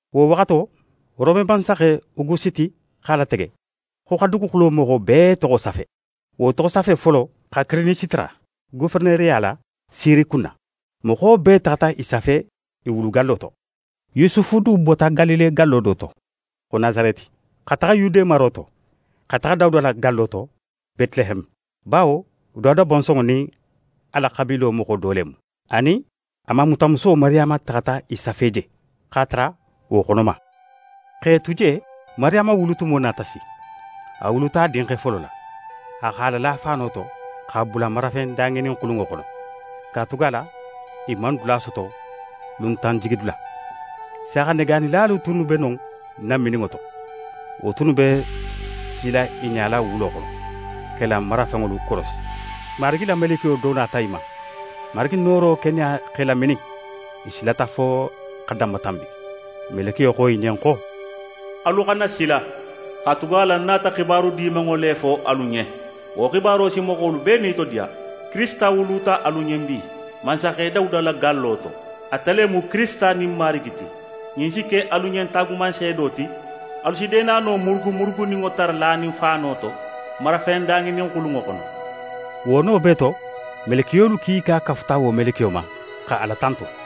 Wo waxato, Rome mansaxe Ogusiti x'a latege, xo xa duguxulo moxo bee toxo safe. Wo toxosafe folo xa Kirinisi tara goferenereya la Siri kunna. Moxo bee taxata i safe i wulugallo to. Yusufu du bota Galile gallo do to, xo Nasareti, xa taxa Yude maro to, xa taxa Dawuda la gallo to, Betileheme, bawo Dawuda bonsonŋo nin a la xabiilo moxo do le mu. A nin a mamutamuso Mariyama taxata i safe je, x'a tara wo xonoma. X'e tu je, Mariyama wulutumo nata si. A wuluta a dinxe folo la. A x'a lala faano to, x'a bula marafen daŋininxulunŋo xono, katugala i man dula soto luntanjigidula. Saaxanegaanilalu tunnu be non namininŋo to. Wo tunnu be sila i ɲala wulo xono, x'e la marafenŋolu korosi. Marigi la melekiyo do nata i ma. Marigi nooro keneya x'e laminin. I silata fo xa danmatanbi. Melekiyo xo i ɲen xo: «Alu xana sila, katugala ń nata xibaru dimanŋo le fo alu ɲen. Wo xibaro si moxolu bee nitodiya. Kirisita wuluta alu ɲen bi, mansaxe Dawuda la gallo to. Ate le mu Kirisita nin Marigi ti. Ɲin si ke alu ɲen taagumanseedo ti: Alu si deenano murugumuruguninŋo tara lanin faano to, marafen daŋininxulunŋo xono.» Wo no bee to, melekiyolu kiika kafuta wo melekiyo ma, xa Ala tantu.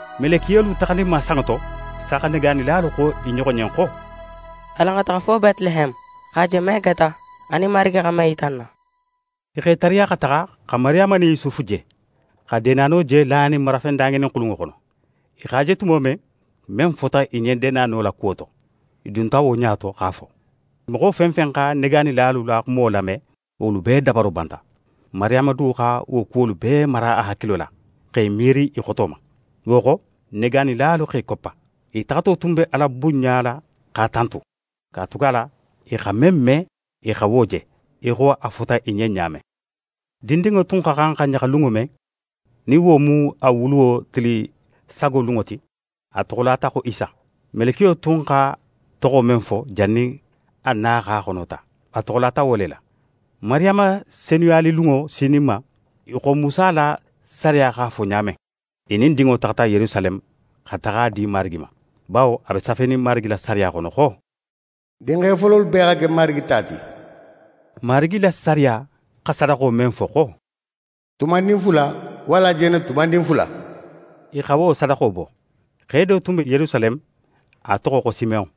Melekiyolu taxaninma sanŋo to, saaxanegaanilalu xo i ɲoxo ɲen xo: «Alan xa taxa fo Betileheme, x'a je men keta, anin Marigi xa men yita n na.» I x'e tariya xa taxa; xa Mariyama nin Yusufu je, xa deenano je lanin marafen daŋininxulunŋo xono. I x'a je tumo men, men fota i ɲen deenano la kuwo to, i dunta wo ɲa to, x'a fo. Moxo fen fen xa negaanilalu la xumo lame, wolu bee dabaro banta. Mariyama du xa wo kuwolu bee mara a hakilo la, x'é miiri i xoto ma. Wo xo, negaanilalu x'e koppa. I taxato tun be Ala bunɲala x'a tantu, katugala i xa men me, i xa wo je, í xo a fota i ɲen ɲa men. Dindinŋo tun xa xan xa ɲaxa lunŋo men, nin wo mu a wuluwo tili sago lunŋo ti, a toxolata xo Isa. Melekiyo tun xa toxo men fo jannin a na x'a xono ta, a toxolata wo le la. Mariyama senuyalilunŋo sininma í xo Musa la sariya x'a fo ɲa men, i nin dinŋo taxata Yerusaleme xa taxa a di Marigi ma, bawo a be safenin Marigi la sariya xono xo: «Dinxe fololu bee xa ke Marigi ta ti.» Marigi la sariya xa sadaxo men fo xo: «Tubandin fula walla jenetubandin fula», i xa wo sadaxo bo. Xe do tun be Yerusaleme, a toxo xo Simeyon.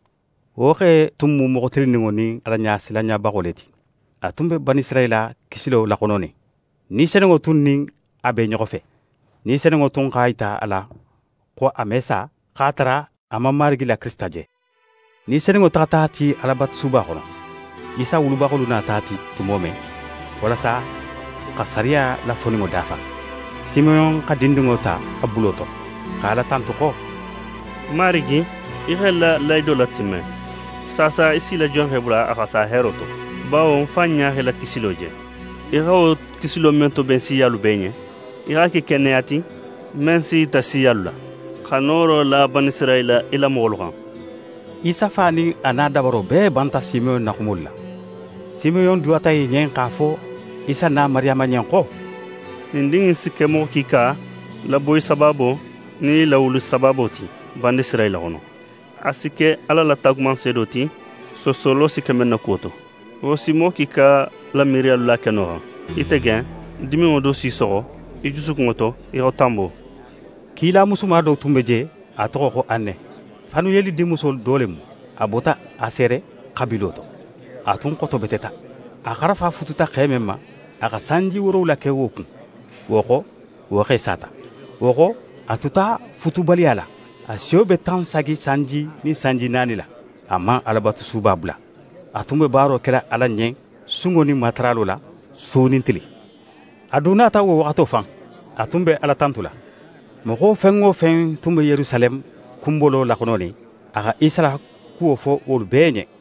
Wo xe tun mu moxo tilinninŋo nin Alaɲasilanɲabaxo le ti. A tun be Banisirayila la kisilo laxononin. Ni Senunŋo tun nin a be i ɲoxo fe. Ni Senunŋo tun x'a yita a la xo a me sa, x'a tara a man Marigi la Kirisita je. Ni Senunŋo taxata a ti Alabatusuba xono. Isa wulubaxolu nata a ti tumo men, walasa xa sariya la foninŋo dafa, Simeyon xa dindinŋo ta a bulo to, xa Ala tantu xo: «Marigi, í x'é la lahido latimme: Saasa í s'í la jonxe bula a xa sa heero to. Bawo ń fan ɲa xa í la kisilo je, í xa wo kisilo men toben siyalu bee ɲen. Í x'a ke keneya ti, men si í yita siyalu la, xa nooro la Banisirayila, í la moxolu xan.» Isa fa nin a na dabaro bee banta Simeyon na xumolu la. Simeyon duwata i ɲen, x'a fo Isa na Mariyama ɲen xo: «Ɲin din in si ke moxo kiika laboyi sabaabo nin i lawuli sabaabo ti Banisirayila xono. A si ke Ala la taagumanseedo ti, soosolo si ke men na kuwo to. Wo si moxo kiika la miiriyalu la keno xan. Ite ken, diminŋo do s'í soxo í jusukunŋo to í xo tanbo.» Kila musuma do tun be je, a toxo xo Ane. Fanuyeli dinmuso do le mu. A bota Asere xabiilo to. A tun xotobeteta. A xarafa fututa xe men ma, a xa sanji woorowula ke wo kun, wo xo, wo xe sata. Wo xo, a tuta futubaliya la. A siyo be tan sagi sanji nin sanji naani la. A man Alabatusuba bula. A tun be baaro kela Ala ɲen sunŋo nin mataralo la, su nin tili. A du nata wo waxato fan; a tun be Ala tantula, moxo fen wo fen tun be Yerusaleme kunbolo laxononin, a xa Isa la kuwo fo wolu bee ɲen.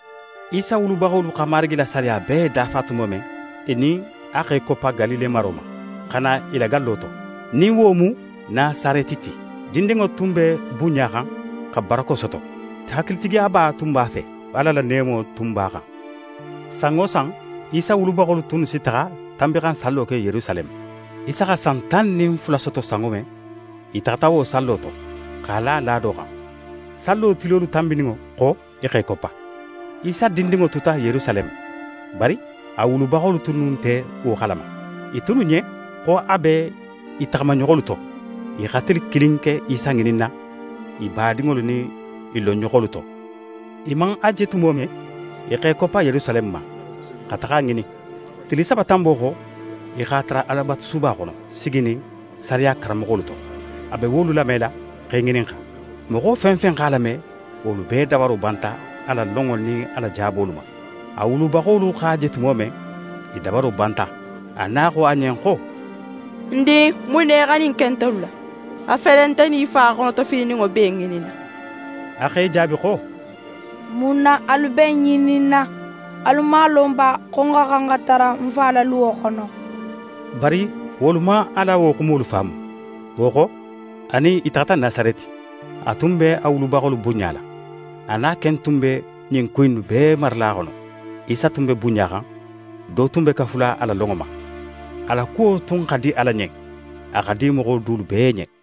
Isa wulubaxolu xa Marigi la sariya bee dafa tumo men, i nin a x'e koppa Galile maro ma, xa na i la gallo to, nin wo mu Nasareti ti. Dindinŋo tun be bunɲaxan xa barako soto. Hakilitigiyaba tun b'a fe, Ala la neemo tun b'a xan. San wo san, Isa wulubaxolu tunnu si taxa Tanbinxansallo ke Yerusaleme. Isa xa san tan nin fula soto sanŋo men, i taxata wo sallo to, x'a la laado xan. Sallo tilolu tanbininŋo xo, i x'e koppa. Isa dindinŋo tuta Yerusaleme, bari a wulubaxolu tunnu nte wo xalama. I tunnu ɲen xo a be i taxamaɲoxolu to. I xa tili kilin ke Isa ŋininna i badinŋolu nin i lonɲoxolu to. I man a je tumo men, i x'e koppa Yerusaleme ma, xa taxa a ŋinin. Tili saba tanbo xo, i x'a tara Alabatusuba xono, siginin sariya karanmoxolu to; a be wolu lamela, x'e ŋininxa. Moxo fen fen x'a lame, wolu bee dabaro banta a la lonŋo nin a la jaabolu ma. A wulubaxolu x'a je tumo men, i dabaro banta. A na xo a ɲen xo: «Ń din, mun na í xa ɲin ke ntelu la? A fele, nte nin í fa xonotofilininŋo b'é ŋininna.» A x'e jaabi xo: «Mun na alu be ń ŋininna? Alu man a lon ba, xo ń xa xan xa tara ń Fa la luwo xono?» Bari wolu man a la wo xumo faamu. Wo xo, a nin i taxata Nasareti. A tun be a wulubaxolu bunɲala. A na ken tun be ɲin ku innu bee marala a xono. Isa tun be bunɲaxan, do tun be kafula a la lonŋo ma. A la kuwo tun xa di Ala ɲen, a xa di moxo dulu bee ɲen.